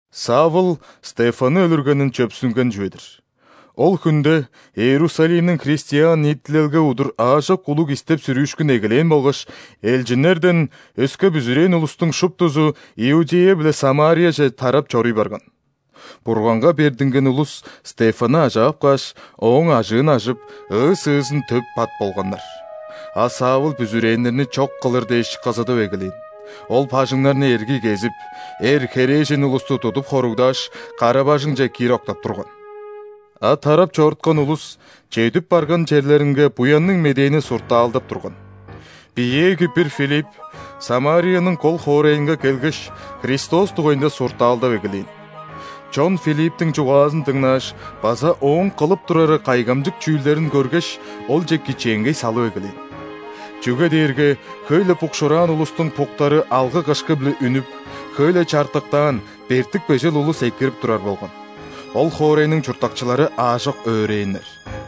Савл Стефанны өлүргенин чөпсүнген чүве-дир. Ол хүнде Иерусалимниң христиан ниитилелге удур аажок улуг истеп-сүрүүшкүн эгелээн болгаш, элчиннерден өске бүзүрээн улустуң шуптузу Иудея биле Самарияже тарап чоруй барган. Бурганга бердинген улус Стефанны ажаап кааш, ооң ажыын ажып, ыы-сыызын төп пат болганнар. А Савл бүзүрээннерни чок кылыр дээш кызыдып эгелээн: ол бажыңнарны эргий кезип, эр, херээжен улусту тудуп хоругдааш, кара-бажыңче киир октап турган. А тарап чоруткан улус чедип барган черлеринге Буянныг Медээни суртаалдап турган. Биеэги бир Филипп Самарияның кол хоорайынга келгеш, Христос дугайында суртаалдап эгелээн. Чон Филипптиң чугаазын дыңнааш база ооң кылып турары кайгамчык чүүлдерин көргеш, олче кичээнгей салып эгелээн. Чүге дээрге хөй-ле букшуураан улустуң буктары алгы-кышкы-биле үнүп, хөй-ле чартыктаан, бертик-бежел улус экирип турар болган. Ол хоорайның чурттакчылары аажок өөрээннер.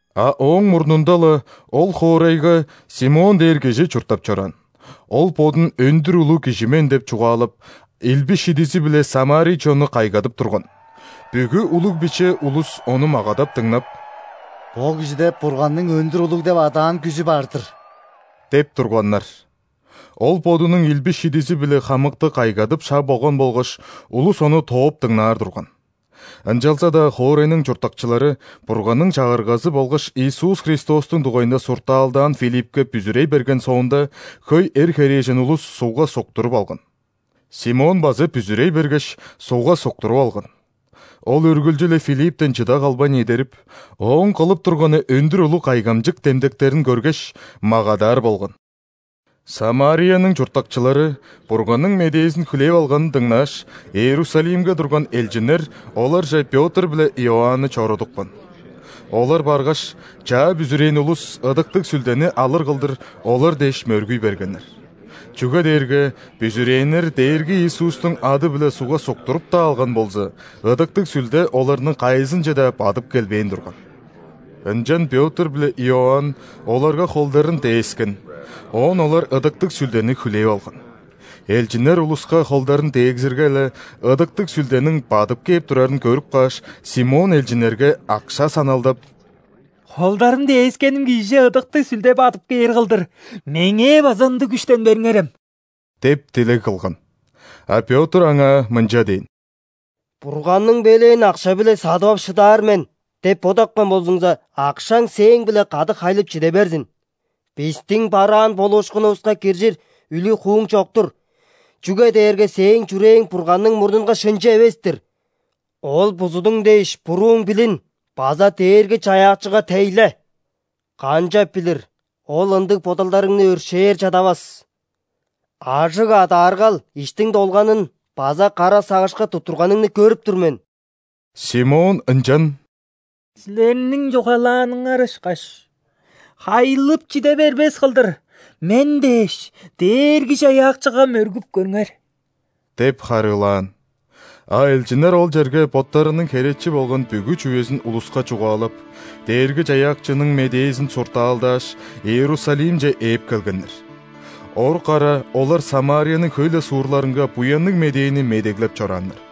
А ооң мурнунда-ла ол хоорайга Симон дээр кижи чурттап чораан, ол бодун өндүр улуг кижи мен деп чугаалап, илби-шидизи-биле ·самарий чонну кайгадып турган. Бүгү улуг-биче улус ону магадап дыңнап: «Бо кижиде Бурганның Өндүр улуг деп адаан күжү бар-дыр» – деп турганнар. Ол бодунуң илби-шидизи-биле хамыкты кайгадып шаг болган болгаш, улус ону тооп дыңнаар турган. Ынчалза-даа хоорайның чурттакчылары Бурганның Чагыргазы болгаш Иисус Христостуң дугайында суртаалдаан Филиппке бүзүрей берген соонда, хөй эр, херээжен улус ·сугга суктуруп алган. Симон база бүзүрей бергеш, сугга суктуруп алган. Ол үргүлчү-ле Филипптен чыда калбайн эдерип, ооң кылып турганы өндүр улуг кайгамчык демдектерин көргеш, магадаар болган. ·Самарияның чурттакчылары Бурганның медээзин хүлээп алганын дыңнааш, Иерусалимге турган элчиннер оларже Пётр биле Иоанны чорудупкан. Олар баргаш, чаа бүзүрээн улус Ыдыктыг Сүлдени алыр кылдыр, олар дээш мөргүй бергеннер. Чүге дээрге бүзүрээннер Дээрги Иисустуң ады-биле сугга суктуруп-даа алган болза, Ыдыктыг Сүлде оларның кайызынче-даа бадып келбээн турган. Ынчан Пётр биле Иоанн оларга холдарын дээскен, оон олар Ыдыктыг Сүлдени хүлээп алган. Элчиннер улуска холдарын дегзирге-ле, Ыдыктыг Сүлдениң бадып кээп турарын көрүп кааш, Симон элчиннерге акша саналдап: «Холдарым дээскеним кижиже Ыдыктыг Сүлде бадып кээр кылдыр, меңээ база ындыг күштен бериңерем» – деп дилег кылган. А Пётр аңаа мынча дээн: «„Бурганның белээн акша-биле садып ап шыдаар мен“ деп бодапкан болзуңза, акшаң сээң-биле кады хайлып чиде берзин! Бистиң бараан болуушкунувуска киржир үлүг-хууң чок-тур, чүге дээрге сээң чүрээң Бурганның мурнунга шынчы эвес-тир. Ол бузудуң дээш, бурууң билин база Дээрги-Чаяакчыга тейле, канчап билир, Ол ындыг бодалдарыңны өршээр чадавас. Ажыг адааргал иштиң долганын база кара сагышка туттурганыңны көрүп тур мен». Симон ынчан: «Силерниң чугаалааныңар ышкаш, хайлып чиде бербес кылдыр, мен дээш Дээрги-Чаяакчыга мөргүп көрүңер» – деп харыылаан. А элчиннер ол черге боттарының херечи болган бүгү чүвезин улуска чугаалап, Дээрги-Чаяакчының медээзин суртаалдааш, Иерусалимче ээп келгеннер. Орук ара олар Самарияның хөй-ле суурларынга Буянныг Медээни медеглеп чорааннар.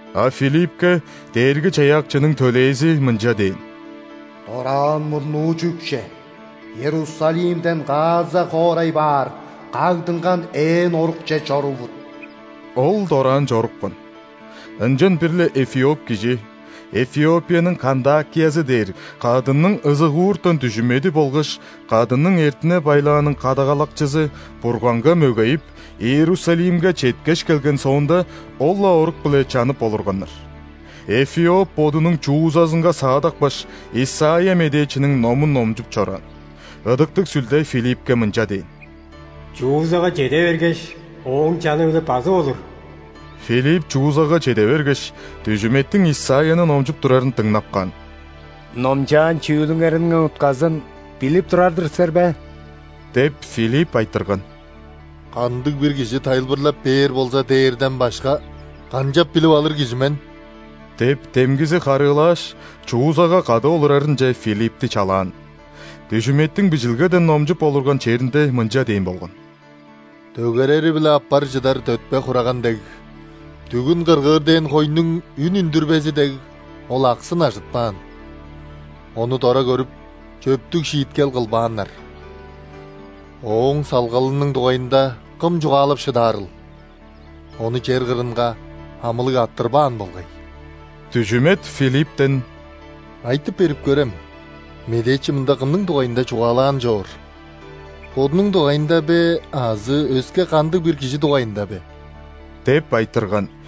А Филиппке Дээрги-Чаяакчының төлээзи мынча дээн: «Дораан мурнуу чүкче, Иерусалимден Газа хоорай баар кагдынган ээн орукче чорувут». Ол дораан чорупкан. Ынчан бир-ле эфиоп кижи – Эфиопияның кандакиязы дээр кадынның ызыгууртан дүжүмеди болгаш кадынның эртине-байлааның кадагалакчызы – Бурганга мөгейип, Иерусалимге четкеш келген соонда, ол-ла орук-биле чанып олурганнар. Эфиоп бодунуң ·чуузазынга саадапкаш, Исайя медээчиниң номун номчуп чораан. Ыдыктыг Сүлде Филиппке мынча дээн: «Чуузага чеде бергеш, ооң чаны-биле базып олур». Филипп чуузага чеде бергеш, дүжүметтиң Исайяны номчуп турарын дыңнап каан. «Номчаан чүүлүңерниң утказын билип турар-дыр силер бе?» – деп, Филипп айтырган. «Кандыг-бир кижи тайылбырлап бээр болза дээрден башка, канчап билип алыр кижи мен?» – деп, демгизи харыылааш, чуузага кады олурарынче Филиппти чалаан. Дүжүметтиң Бижилгеден номчуп олурган черинде мынча дээн болган:«Дөгерери-биле аппар чыдар дөтпе-хураган дег,дүгүн кыргыыр дээн хойнуң үн үндүрбези дег, ол аксын ажытпаан. Ону дора көрүп, чөптүг шииткел кылбааннар.Ооң салгалының дугайында кым чугаалап шыдаарыл?Ону чер кырынга амылыг арттырбаан болгай». Дүжүмет Филипптен: «Айтып берип көрем, медээчи мында кымның дугайында чугаалаан чоор: бодунуң дугайында бе азы өске кандыг-бир кижи дугайында бе?» – деп айтырган.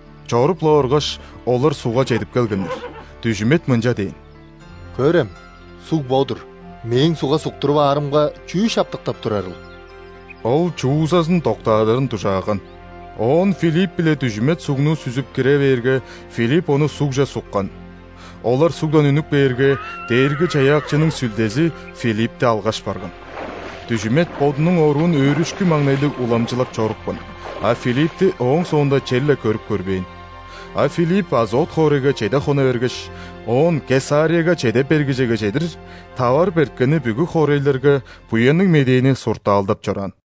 Чоруп-ла оргаш, олар ·сугга чедип келгеннер. Дүжүмет мынча дээн: «Көрем, суг бо-дур. Мээң сугга суктуруп аарымга чүү шаптыктап турарыл?» Ол чуузазын доктаадырын дужааган. Оон Филипп биле дүжүмет сугну сүзүп кире бээрге, Филипп ону ·сугже суккан. Олар сугдан үнүп кээрге, Дээрги-Чаяакчының Сүлдези Филиппти алгаш барган. Дүжүмет бодунуң оруун өөрүшкү-маңнайлыг уламчылап чорупкан, а Филиппти ооң соонда черле көрүп көрбээн. А Филипп Азот хоорайга чеде хона бергеш, оон Кесарияга чеде бергижеге чедир, таварып эрткени бүгү хоорайларга Буянныг Медээни суртаалдап чораан.